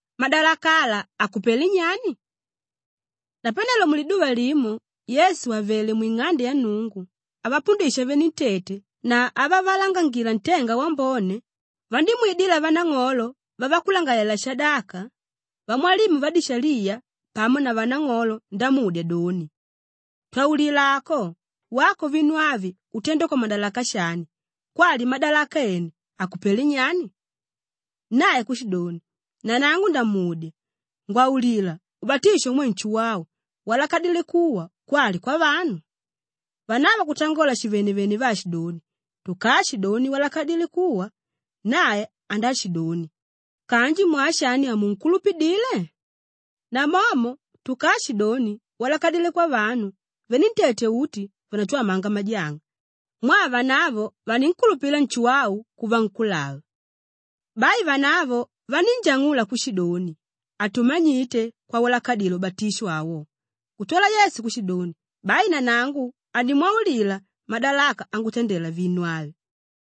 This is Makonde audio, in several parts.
Madalaka ala akupelé nyani? Napanelo muliduva limo Yesu àvele mwing'ande ya Nnungu avapundisha venentete na avavalangangila ntenga wambone, vandímwidila vanang'olo vavakulangalalela-shadaka, vamwalimu vadishaliya pamo na vanang'olo ndamudya doni, “Twaulila ako! Wako vinu avi utenda kwamadalaka shani kwali madalaka ene akupelé nyani?” Nae kushidoni, “Nanangu ndamudya. Ngwaulila, ubatisho umwe Nshuwau walakadilé kuwa kwali kwavanu?” Vanavo kutangola shivenevene vaashidoni, “Tukaashidoni walakadilé kuwa, nae andaashidoni, ‘Kanji mwaa shani hamunkulupidile?’ Namomo tukaashidoni, ‘Walakadilé kwavanu,’ venentete uti vandatwamanga majanga mwaa vanavo vaninkulupila Nshuwau kuva nkúlava.” Bai vanavo vanínjang'ula kushidoni, “Hatumanyite kwawalakadile ubatisho awo.” Kutwala Yesu kushidoni, “Bai nanangu hanimwaulila madalaka angutandela vinu avi.”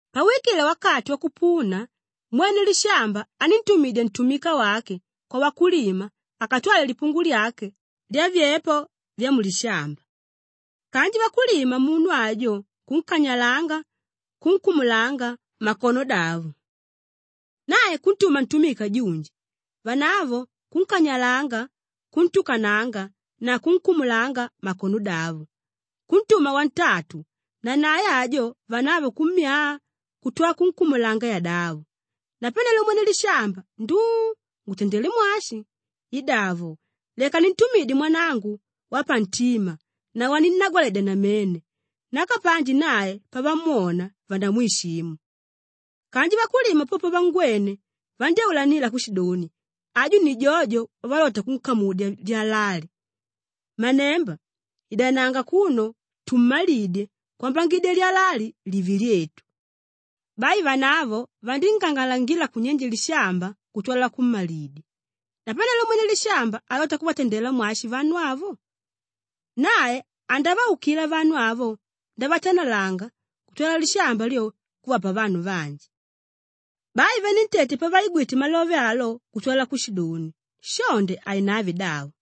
Pauwikile wakati wakupuna, mwene lishamba aníntumidya ntumika wake kwavakulima akatwale lipungu lyake lyavyepo vyamulishamba kanji vakulima munu ajo kunkanyalanga kunkumulanga makonodavo. Nae kuntuma ntumika junji, vanavo kunkanyalanga, kuntukananga na kunkumulanga makonodavo. Kuntuma wantatu nanae ajo vanavo kummyaa kutwala kunkumulanga yadavo. Napanelo mwene lishamba, ‘Nduu! Ngutandelé mwashi? Idavo, leka nintumidye mwanangu wapantima na waninnagwaledya namene nakapanji nae pavamwona, vandamwishimu.’ Kanji vakulima po pavangwene, vandyáulanila kushidoni, ‘Aju ni jojo wavalota kunkamudya lyala ali. Mmanemba! Idananga akuno tummalidye kwambangidya lyala ali live lyetu.’ Bai vanavo vandíngang'alangila kunyenje lishamba kutwala kummalidya. Napanelo mwene lishamba alota kuvatandela mwashi vanu avo? Nae andavaukila vanu avo ndavatanalanga kutwala lishamba lyo, kuvapa vanu vanji.” Bai venentete pavaigwite malove alo kutwala kushidoni, “Shonde hainave davo.”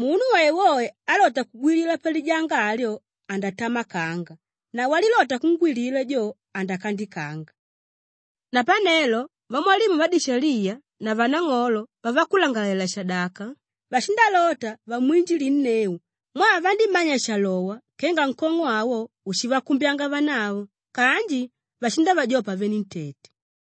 Munu woewoe álota kugwilila palijanga alyo, andatamakanga na walilota kungwilila jo, andakandikanga.” Napanelo vamwalimu vadishaliya na vanang'olo vavakulangalalela-shadaka vashindalota vamwinjilinneu mwaa vandímanya shalowa kenga nkong'o awo ushivakumbyanga vanavo kanji vashindavajopa venentete.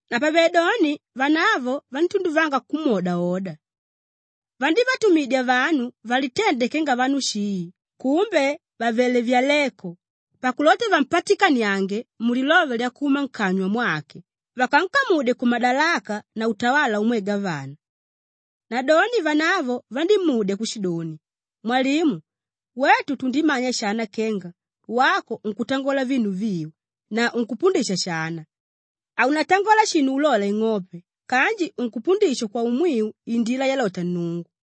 Napavedoni vanavo vandítunduvanga kumwodaoda. Vandívatumidya vanu valitende kenga vanu shii kumbe vàvele vyaleko pakulota vampatikaniange mulilove lyakuma nkanywa mwake vakankamudye kumadalaka na utawala umwe gavana. Nadoni vanavo vandímudya kushidoni, “Mwalimu, wetu tundimanya shana kenga wako unkutangola vinu viu na unkupundisha shana; haunatangola shinu ulola ing'ope kanji unkupundisha kwaumwiu indila yalota Nnungu.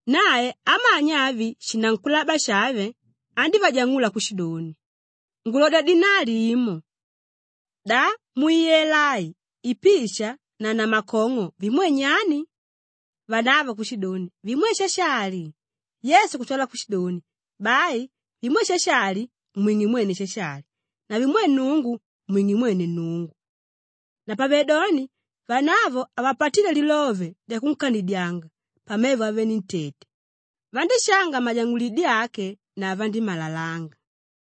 Nae amanya avi shinankulaba shave andívajang'ula kushidoni, “Ngulodya dinali imo. Da muyela ai ipisha na namakong'o vimwe nyani?” Vanavo kushidoni, “Vimwe Shashali.” Yesu kutwala kushidoni, “Bai vimwe Shashali, mwing'e mwene Shashali na vimwe Nnungu, mwing'e mwene Nnungu.” Napavedoni vanavo havapatíle lilove lyakunkanidyanga pamevo avenentete, vandíshanga majang'ulidi ake na vandímalalanga.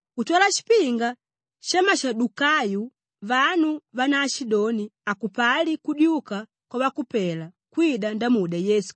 Kutwala shipinga shamashadukayo vanu vánaashidoni hakupali kudyuka kwavakupela kwida ndamudya Yesu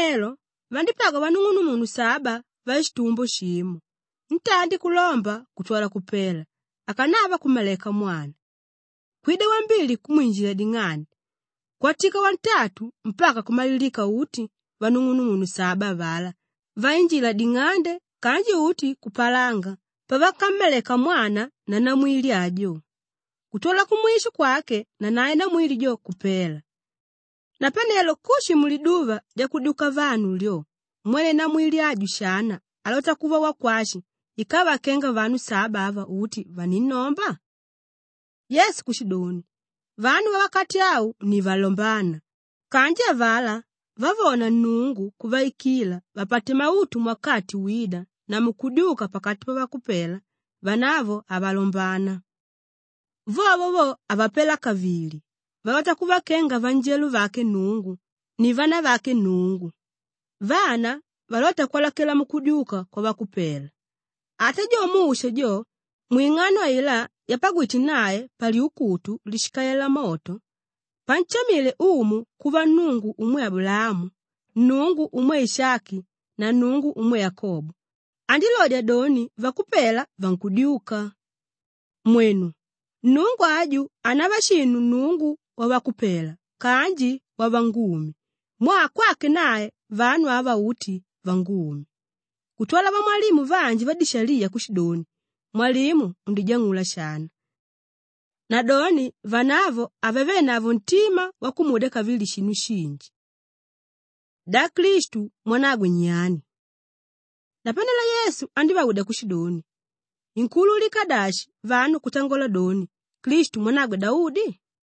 Napanelo vandípagwa vanung'unumunu saba vashitumbo shimo; ntandi kulomba kutwala kupela akanava kummaleka mwana. Kwida wambili kwinjila ding'ande, kwatika wantatu mpaka kumalilika uti vanung'umunu saba avalá vainjila ding'ande kanji uti kupalanga pavakammaleka mwana na namwili ajo kutwala kumwisho kwake nanae namwili jo kupela. Napanelo kushi muliduva lyakudyuka vanu lyo, mwene namwili aju shana alota kuva wakwashi ikava kenga vanu saba ava uti vaninnomba?” Yesu kushidoni, “Vanu vawakati au ni valombána kanji avalá vavóna Nnungu kuvaikila vapate mautu muwakati wída na mukudyuka pakati pavakupela, vanavo havalombana. Vovo vo, havapela kavili valota kuva kenga vanjelo vake Nnungu ni vanavake Nnungu, vana valóta kwalakela mukudyuka kwavakupela. Ata jo Musha jo, mwing'ano ailá yapagwíte nae palyukutu líshikalela moto, panshamile Umu kuva Nnungu umwe Abulaamu, Nnungu umwe Ishaki na Nnungu umwe Yakobo, andilodya doni vakupela vankudyuka. Mwenu, Nnungu aju hanava shinu Nnungu wavakupela kanji wavangumi mwaa kwake nae vanu ava uti vangumi.” Kutwala vamwalimu vanji vadishaliya kushidoni, “Mwalimu, undijang'ula shana.” Nadoni vanavo havavenavo ntima wakumudya kavili shinu shinji. Da Klistu mwanagwe nyani? Napanelo Yesu andívaudya kushidoni, “Inkuululika dashi vanu kutangola doni, Klistu mwanagwe Daudi?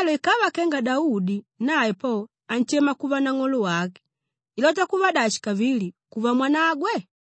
Napanelo ikava kenga Daudi nae po anshema kuva Nang'olo wake, ilota kuva dashi kavili kuva mwanagwe?”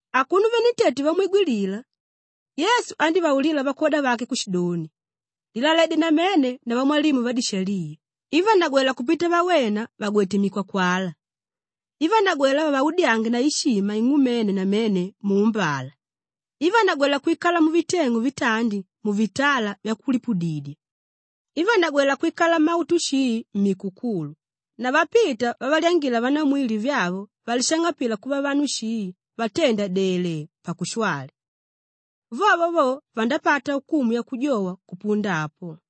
Akuno venentete vamwigwilila, Yesu andívaulila vakwoda vake kushidoni, “Lilaledye namene na vamwalimu vadishaliya ivanagwéla kupita vawena vàgwete mikwakwala, ivanagwéla vavaudyange na ishima ing'umene namene muumbala, ivanagwéla kwikala muviteng'u vitandi muvitala vyakulipudidya, ivanagwéla kwikala mumautu shii mmikukulu na vapita vavalyangila vanamwili vyavo valishang'apila kuva vanu shii vatenda delee, pakushwali. Vovo vo, vandapata ukumu yakujowa kupunda apo.”